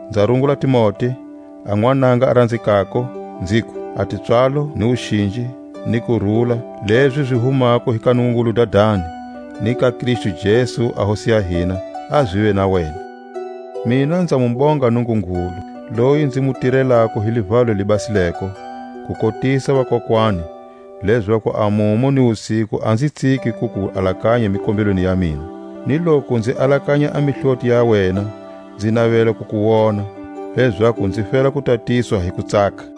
nza rungula Timote, a nwananga a ranzekako, nziku: A tipswalo, ni wuxinji, ni kurula, lezi zi humako hi ka Nungungulu Dadani, ni ka Kristu Jesu a Hosi ya hina, a zive na wena. Kustumunya hi Hosi ya hina. Mina nza mu bonga Nungungulu, loyi nzi mu tirelako hi livalo li basileko, kukotisa vakokwani, lezaku a mumu ni wusiku a nzi tsiki ku ku alakanya mikombelweni ya mina, ni loku nzi alakanya a mihloti ya wena, nzi navela ku ku wona, lezaku nzi fela ku tatiswa hi kutsaka;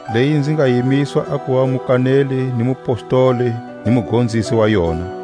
leyi nzi nga yimiswa a kuva mukaneli ni mupostoli ni mugonzisi wa yona.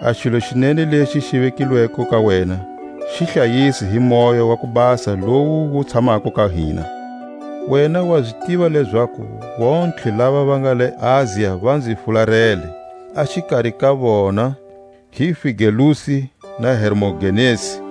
A xilo xi nene lexi xi vekilweko ka wena, xi hlayise hi Moya wa ku Basa lowu wu tshamako ka hina. Wena wa zi tiva lezaku vontlhe lava va nga le Asia va nzi fularele; a xikari ka vona hi Figelusi na Hermogenesi.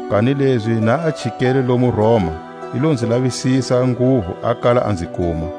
Kanilezi na a chikele lomu Roma, i lo nzi lavisisa nguvu a kala a nzi kuma.